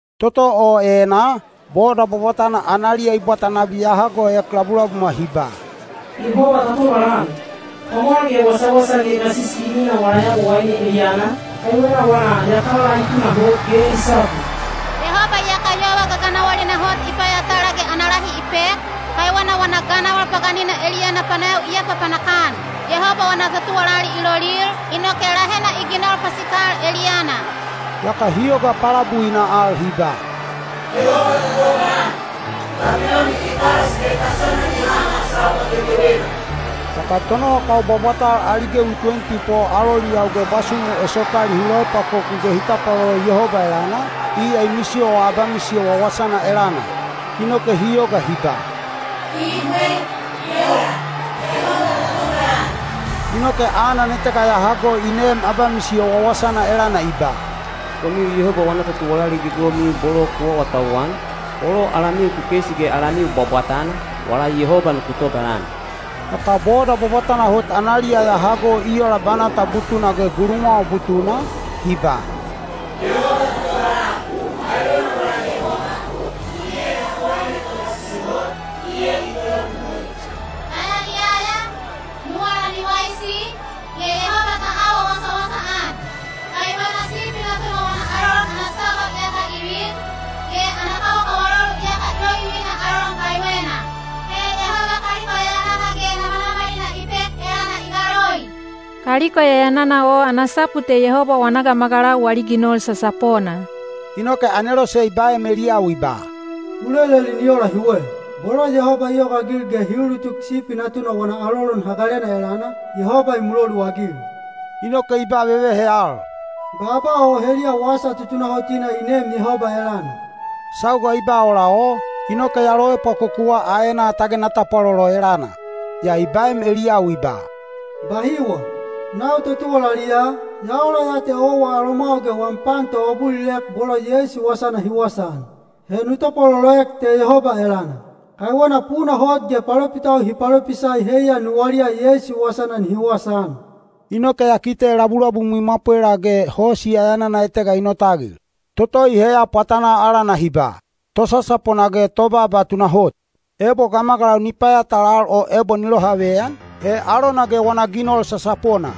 Toto o enaa, boda bwabwatana analiya i bwata nabi ya hagoek labulabumwa hi ba, “Yehoba ta tobalan! Pwamwal ge wasawasa ge gasisi i minaa wala Yabowaine eliyana, kaiwena wana yatala i tunahot ge i sapu. Yehoba iyaka yova gaganawalina hot i payatala ge ana lahi i pek, kaiwena wana ganawal paganina eliyana panayawi i apapanak-an. Yehoba wana totuwalali i lolil, inoke lahena i ginol pasikal eliyana.” Yaka hi yoga palabuina al hi ba, “Yehoba ta tobalan! Babiloni i kalas ge kasona ni haha sauga gegewena.” Yaka tonowakau bwabwatal ali gewi tuwenti po aloliyau ge bwasumu esopali hi loepwakoku ge hi tapwalolo Yehoba elana, iya i misiyowa abamisiyo wawasana elana. Inoke hi yoga hi ba, “Ibwe. I ola. Yehoba ta tobalan!” Inoke anan etega ya hago i neem abamisiyo wawasana elana i ba, “Komiu Yehoba wana totuwalali gegewemiu bolo ku awatauwan, bolo alamiu kekeisi ge alamiu bwabwatana, wala Yehoba nuku tobalan!” Yaka boda bwabwatana hot analiya ya hago i ola banata butuna ge gulumwawa butuna, hi ba, “Yehoba ta tobalan! Kaiwena wala Yehoba, iya Yabowaine Togasisi Hot, iya i tologugui. Ta yaliyaya, nuwala ni waisi, ge Yehoba ta awa wasawasaan! Kaiwena Sipi Natuna wana alolon ana sauga iyaka i vin, ge ana kawakawalolu iyaka i lovivina alolon kaiwena. He Yehoba kaliko yayanana ge namanamalina i pek elana i galoi.” (Kaliko yayanana o ana sapu te Yehoba wana gamagalau wali ginol sasapona.) Inoke anelose i baem eliyau i ba, “U leleli ni ola hiwe, ‘Bolo Yehoba i yogaagil ge hi ulutuk Sipi Natuna wana alolon hagalena elana, Yehoba i muloluagil.’” Inoke i ba vevehe al, “Baaba o heliya wasa tutunahotina i neem Yehoba elana.” Sauga i ba ola o, inoke ya loepwakokuwa aenaa tage na tapwalolo elana. Yaa i baem eliyau i ba, “Bahiwa! Nau totuwalali ya, ya ola ya te owa alomwau ge wam pan toabulilek bolo Yeisu wasana hi wasaan. He nu tapwaloloek te Yehoba elana. Kaiwena puna hot ge palopitau hi palopisai heiya nuwaliya Yeisu wasana nihi wasaan.” Inoke ya kite labulabum i mwapwela ge hosi yayanana etega i notagil. Toto i heya pwatanaa alana hi ba, “Tosasapona ge Tobaaba Tunahot.” Ebo gamagalau ni payatalal o ebo ni lohaveyan, he alona ge wana ginol sasapona.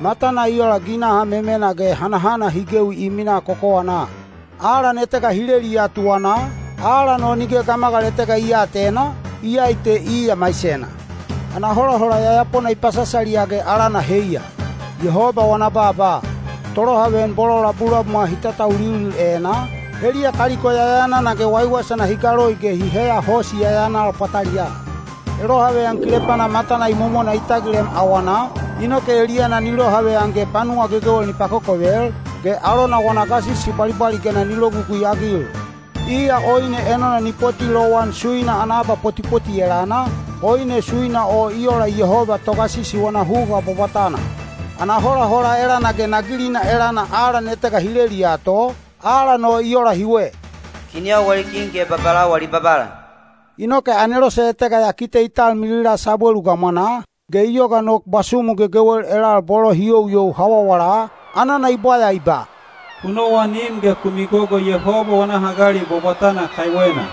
Matana i ola ginaha memena ge hanahana hi gewi i minaa kokowanaa. Alan etega hi leliya tuwanaa, alan o nige gamagal etega i aatena, iyai te iya maisena. Ana holahola yayapona i pasasaliya ge alana heiya, “Yehoba wana Baaba.” Tolohaveyan bolo labulabumwa hi tatauliulil enaa, heliya kaliko yayanana ge waiwaisana hi galoi ge hi heya hosi yayanal pwataliyaa. Elohaveyan kilepana matana imomona i tagilem awanaa, inoke eliyana ni lohaveyan ge panuwa gegewel ni pakokovel, ge alona wana gasisi bwalibwaligena ni logugui-agil. Iya oine enona ni poti lowan suina ana abapotipoti elana, oine suina o i ola Yehoba Togasisi wana huga bwabwatana. Ana holahola elana ge nagilina elana alan etega hi leliya to, alan o i ola hiwe, “Kinyau wali kin ge babalau wali Babala.” Inoke anelose etega ya kite i talmilila sabwelu gamwanaa, ge i yoga nok bwasumu gegewel elal bolo hi youyou hawawala, anana i bwaya i ba, “Ku nowanim ge ku migogo Yehoba wana hagali bwabwatana kaiwena.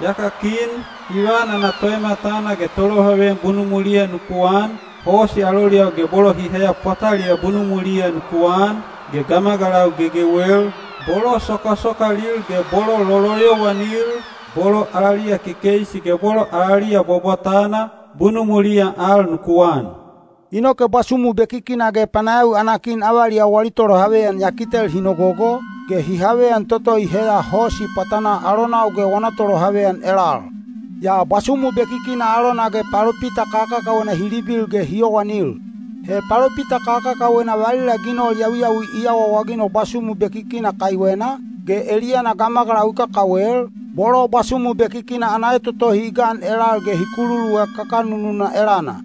Yaka kin, ivan ana toematana ge tolohaveyan bunumwiliya nuku an, hosi aloliyau ge bolo hi heya pwataliyaa bunumwiliya nuku an, ge gamagalau gegewel, bolo sokasokalil ge bolo loloyowanil, bolo alaliya kekeisi ge bolo alaliya bwabwatana, bunumwiliya al nuku an.” Inoke bwasumu bekikina ge panayawi ana kin avaliyau wali tolohaveyan ya kitel hi nogogo, ge hi haveyan toto i heya hosi pwatanaa alonau ge wana tolohaveyan elal. Yaa bwasumu bekikina alona ge palopita kakakawena hi libil ge hi yowanil. He palopita kakakawena valila ginol yawiyawi i awaawaginol bwasumu bekikina kaiwena, ge eliyana gamagalau i kakawel, bolo bwasumu bekikina ana etotohi i gan elal ge hi kululuek kakanununa elana.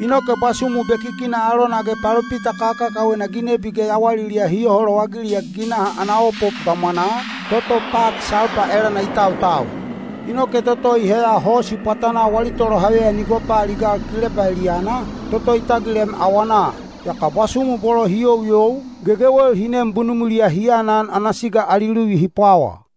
Inoke bwasumu bekikina alona ge palopita kakakawena ginebi ge yawaliliya hi yoho lowagiliek ginaha ana opop gamwanaa, toto pat salpa elana i tautau. Inoke toto i heya hosi pwatanaa wali tolohaveyan i gopaaligal kilepa eliyana, toto i tagilem awanaa. Yaka bwasumu bolo hi youyou, gegewel hi nem bunumwiliya hi anan ana siga ali luvi hi pwawa.